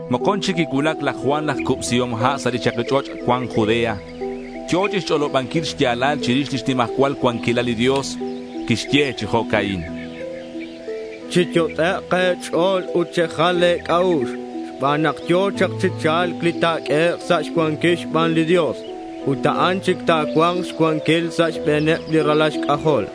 Mokon chic quicuulac laj Juan laj Cubsihom Ha' sa' li chaki ch'och' cuan Judea. Yo̱ chixch'olobanquil xya̱lal chirix lix nimajcual cuanquilal li Dios. Quixye chi jo'ca'in: —Chiyot'ek' e̱ch'o̱l ut chejal e̱c'a'ux xban nak yo̱ chak chi cha̱lc li ta̱q'uehek' sa' xcuanquil xban li Dios. Ut a'an chic ta̱cua̱nk xcuanquil sa' xbe̱neb li ralal xc'ajol.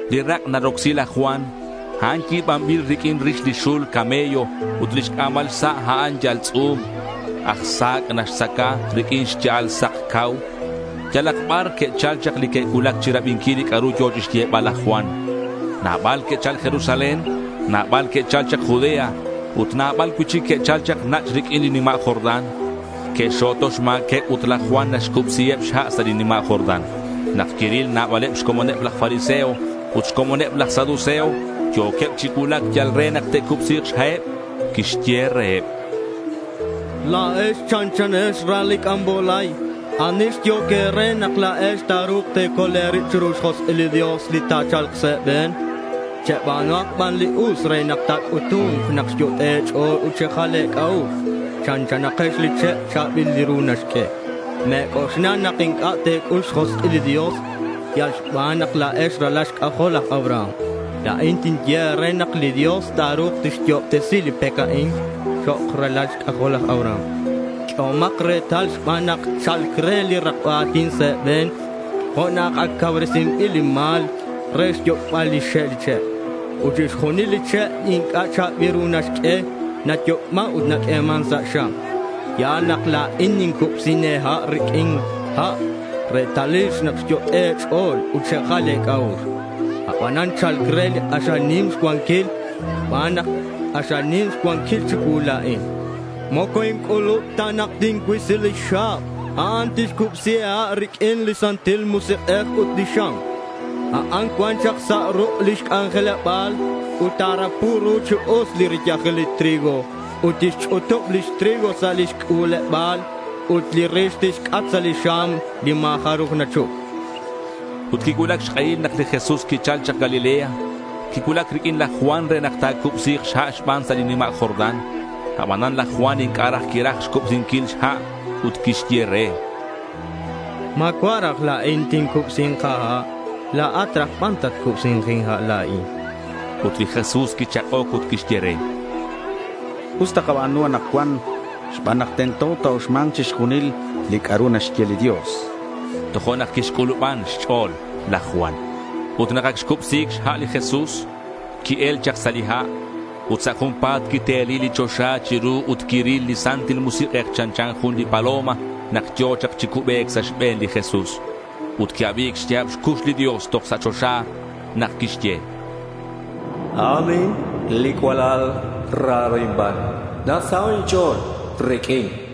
Li rak' narocsi laj Juan, a'an yi̱banbil riq'uin rix li xul camello ut lix c'a̱mal xsa' a'an yal tz'u̱m. Aj sa̱c' naxtzaca riq'uin xya'al sak c'au. Yalak bar que'chal chak li que'cuulac chirabinquil li c'a'ru yo̱ chixyebal laj Juan. Nabal que'chal Jerusalén. Nabal que'chal chak Judea ut nabal cui'chic que'chal chak nach' riq'uin li nima' Jordán. Que'xxo̱to xma̱queb ut laj Juan naxcubsiheb xha' sa' li nima' Jordán. Nak quiril nabaleb xcomoneb laj fariseo ut xcomoneb laj saduceo yo̱queb chi cuulac yal re nak te'cubsi̱k xha'eb, quixye reheb: —La̱ex chanchanex li ral li c'ambolay. ¿Ani xyehoc e̱re la̱ex nak ta̱ru̱k te̱col e̱rib chiru lix josk'il li Dios li ta̱cha̱lk sa' e̱be̱n? Cheba̱nuhak ban li us re nak ta̱c'utu̱nk nak xyot'e' e̱ch'o̱l ut xejal e̱c'a'ux. Chanchanakex li che' cha̱bil li ru naxq'ue. Me̱c'oxla nak inc'a' te̱c'ul xjosk'il li Dios yal xban nak la̱ex ralal xc'ajol laj Abraham. La̱in tinye e̱re nak li Dios ta̱ru̱k tixyo'obtesi li pec a'in chok' ralal xc'ajol laj Abraham. Q'uehomak retal xban nak cha̱lc re li rakba a̱tin sa' e̱be̱n jo' nak ac cauresinbil li ma̱l re xyoc'bal lix xe' li che'. Ut chixjunil li che' inc'a' cha̱bil li ru naxq'ue, nayoc'man ut naq'ueman sa' xam. Ya̱l nak la̱in nincubsi e̱ha' riq'uin ha' retalil nak xyot'e' e̱ch'o̱l ut xejal e̱c'a'ux. Abanan cha̱lc re li k'axal nim xcuanquil. Xban nak k'axal nim xcuanquil chicuu la̱in, moco inc'ulub ta nak tincuisi lix xa̱b. A'an tixcubsi e̱ha' riq'uin li Santil Musik'ej ut riq'uin xam. Ac cuan chak sa' ruk' lix c'anjeleba̱l. Ut ta̱rapu ru chi us li riyajil li trigo ut tixch'utub lix trigo sa' lix c'u̱leba̱l ut li rix tixc'at sa' li xam li ma̱ jaruj nachup, chan laj Juan. Ut quicuulac xk'ehil nak li Jesús quichal chak Galilea. Quicuulac riq'uin laj Juan re nak ta̱cubsi̱k xha' xban sa' li nima' Jordán. Abanan laj Juan inc'a' raj quiraj xcubsinquil xha' ut quixye re: —Ma̱cua' raj la̱in tincubsi̱nk a̱ha'. La̱at raj ban tatcubsi̱nk inha' la̱in, chan. Ut li Jesús quichak'oc ut quixye re: —Us takaba̱nu anakcuan xban nak tento ta̱uxma̱nk chixjunil li c'a'ru naxye li Dios, chan. Tojo'nak quixc'uluban xch'o̱l laj Juan. Ut nak ac xcubsi̱c xha' li Jesús, qui-el chak sa' li ha'. Ut sa' junpa̱t quiteli li choxa chiru ut quiril li Santil Musik'ej chanchan jun li paloma nak yo̱ chak chi cubec sa' xbe̱n li Jesús. Ut qui-abi̱c xya̱b xcux li Dios toj sa' choxa nak quixye: —A'an a'in li cualal raro inban. Nasaho' inch'o̱l riq'uin, chan.